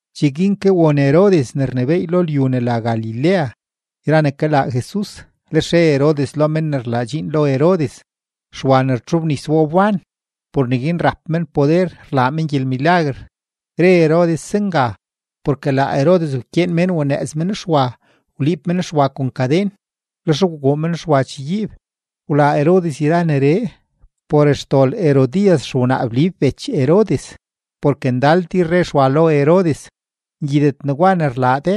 Cheguin ke won Herodes ne rnebééy lo lyu ne la Galilea yra ne kalaa Jesus, lex re Herodes lo men ne rlaa dxiin lo Herodes: ―Xwa ne rtxobnis wa wban. Por neguin rap men poder rlaa men gyelmilaguer. Re Herodes zenga porke laa Herodes wkyeen mén wanëëz men Xwa, wliib men Xwa kon kaden; lex wguu men Xwa chegyiib. Wlaa Herodes yra neree por xdol Herodías xewnaa Blib bech Herodes. Porke ndal tir re Xwa lo Herodes: ―Ngyidet negwa ne rlaa de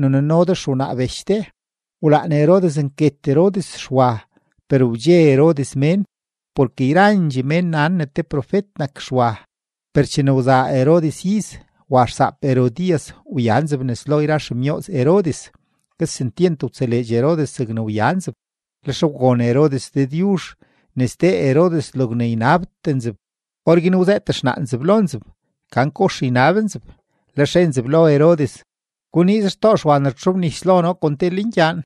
ne nuno de xewnaa bech de. Wlaan Herodes nket Herodes Xwa, per wdxe Herodes mén porke yrandxee mén nan ne te profet nak Xwa. Per chene wzaa Herodes iz, wa xsaap Herodías wya nzeb nes lo yra xemyooz Herodes; kesentyent wtseleedx Herodes zegne wya nzeb. Lex wgon Herodes Dëdyuzh ne sdee Herodes logne ynabtee nzeb. Orguin wzëët xnaa nzeb lo nzeb gan kox ynab nzeb, lex re nzeb lo Herodes: ―Guniiz xtoo Xwa ne rtxobnis lo noo kon te lengyaan.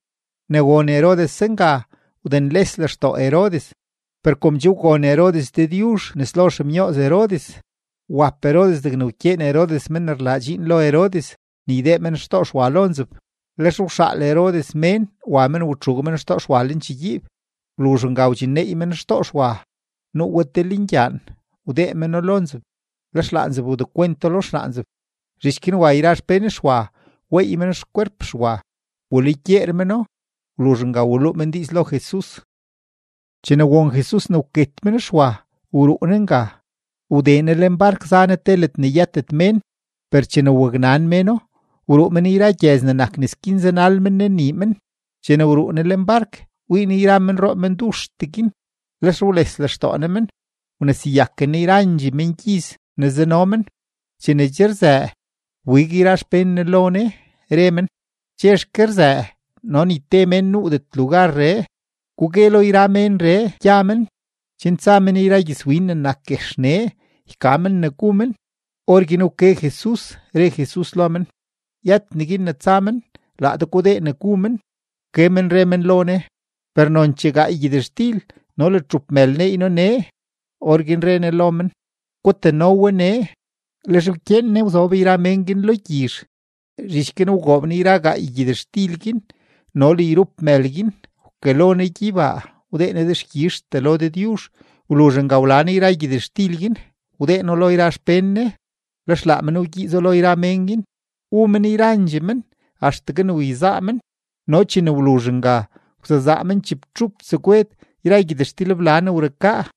Ne won Herodes zenga, wdenles lextoo Herodes; per kom che wgon Herodes Dëdyuzh nes lo xemyooz Herodes, wap Herodes degne wkyeen Herodes men ne rlaa dxiin lo Herodes ne ydee men xtoo Xwa lo nzeb. Lex wxaal Herodes mén wa men watxuug men xtoo Xwa lenchegyiib. Wluzh nga wdxinneey men xtoo Xwa, nuu we te lengyaan, wdee meno lo nzeb, lex laa nzeb wdekwento lo xnaa nzeb. Zhich guin wa yra xpén Xwa weey men xkwerp Xwa, walugyeer meno. Wluzh nga waluu men diiz lo Jesus. Chene won Jesus ne wket men Xwa, wruu Ne nga, wdee Ne lenbark za Ne te ledne yëtet mén. Per chene waknan méno, wruu men yra gyëz ne nak nes guin zanal men Ne nii men. Chene wruu Ne lenbark, wii Ne yra menroo menduxtee guin; lex wles lextoo Ne men, wneseyaken Ne yrandxee mengyiz ne zano men. Chene che rzëë, wbig yra xpén Ne lo Ne, re men: ―Chexke rzëë no ni te mén nuudet lugarree. Gugue lo yra ménree gya men chen tsa men yra gyëzwin ne nak guex nee yka men ne gu men. Orguin wke Jesus, re Jesus lo men: ―Yët neguin ne tsa men; laa de gudee ne gu men. Wke men re men lo Ne: ―Per nonchee gaay gyëtxtil no le txup mël neey noo nee. Orguin re Ne lo men: ―Gutano we nee. Lex wkyeen Ne wzob yra mén guin lo gyizh. Zhich guin wgoob Ne yra gaay gyëtxtil guin no le yrup mël guin, wkalo Ne gyeybaa, wdee Ne dexkyizhtee lo Dëdyuzh. Wluzh nga wla Ne yra gyëtxtil guin, wdee No lo yra xpén Ne, lex laa men wgyiizo lo yra mén guin. Wu men yrandxee men axtegue ne wyezaa men, no chene wluzh nga, wsezaa men chibtxup tsegwed yra gyëtxtilbla ne wrukaa.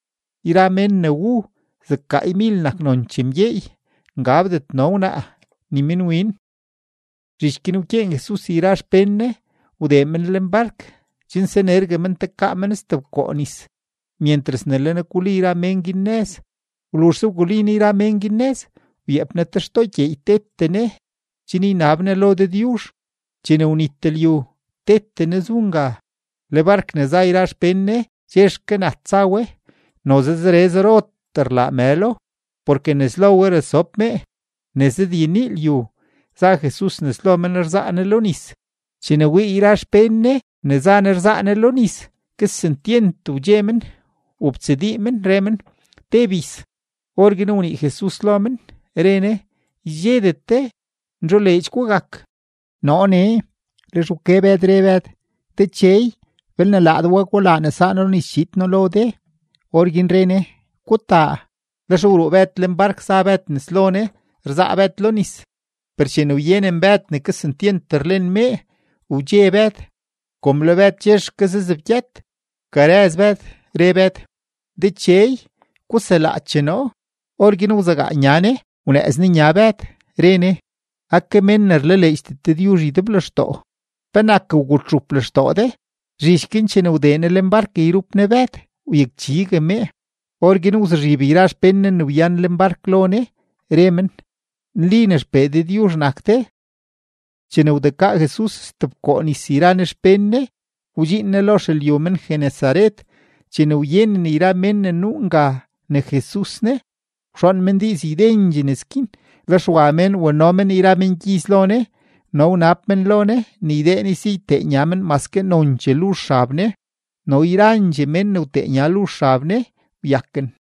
Yra mén guin ne wu, zeg gaaymil nak nonchee mgyeey, ngabdet no wnaa ni minwin. Zhich guin wkyeen Jesus yra xpén Ne wdee men lenbark chen sanergue men tekaa men stebkoo nis, myentras ne le Ne guli yra mén guin nëz. Wluzhse wguli Ne yra mén guin nëz, wyeep Ne te xtoo gyeey tete Ne chen ynab Ne lo Dëdyuzh. Chene wnit lyu, tete Ne zu nga. Le bark ne za yra xpén Ne chexke nat za we. Noze zere zerotee rlaa mëlo, porke nes lo we rasob mee. Ne zëdyenii lyu, za Jesus nes lo men rzaa Ne lo nis. Chene wii yra xpén Ne ne za Ne rzaa Ne lo nis, kesentyent wdxe men, wobtsadii men, re men: ―¡Te bis! Orguin wnii Jesus lo men, re Ne: ―¡Ydxedet de, nzholeedx gugak, noo nee! Lex wke Bëd, re Bëd: ―Dechey, belne laa de wa, gulaa ne saa noo lo nis chiid noo lo de. Orguin re Ne: ―Gutaa. Lex wruu Bëd lenbark za Bëd nes lo Ne rzaa Bëd lo nis. Per chene wyenen Bëd ne kesentyent rlen mee, wdxe Bëd; kom le Bëd chexke zazebgyët, wkarëz Bëd, re Bëd: ―¡Dechey, guselaache noo! Orguin wzegaa Ne nya Ne wnëëz Ne nya Bëd, re Ne: ―¡Ake mén ne rlaleedxdet Dëdyuzh ydeblextoo! ¿Penak wgutxup lextoo de? Zhich guin chene wdee Ne lenbark yrup Ne Bëd, wyakchigue mee. Orguin wzuzhib yra xpén Ne ne wyan lenbark lo Ne, re men: ―¡Nli ne XPee Dëdyuzh nak de! Chene wdekaa Jesus stebkoo nis yra Ne xpén Ne, wdxiin Ne lo xelyu men-Genesaret. Chene wyenen yra mén ne nuu nga ne Jesus ne, wxoon men diiz ydendxee nes guin, lex wa mén wano men yra mengyiz lo Ne. No wnab men lo Ne ne ydee Ne si ytee nya men maske nonchee luzh xab Ne, no yrandxee mén ne wtee nya luzh xab Ne wyaken.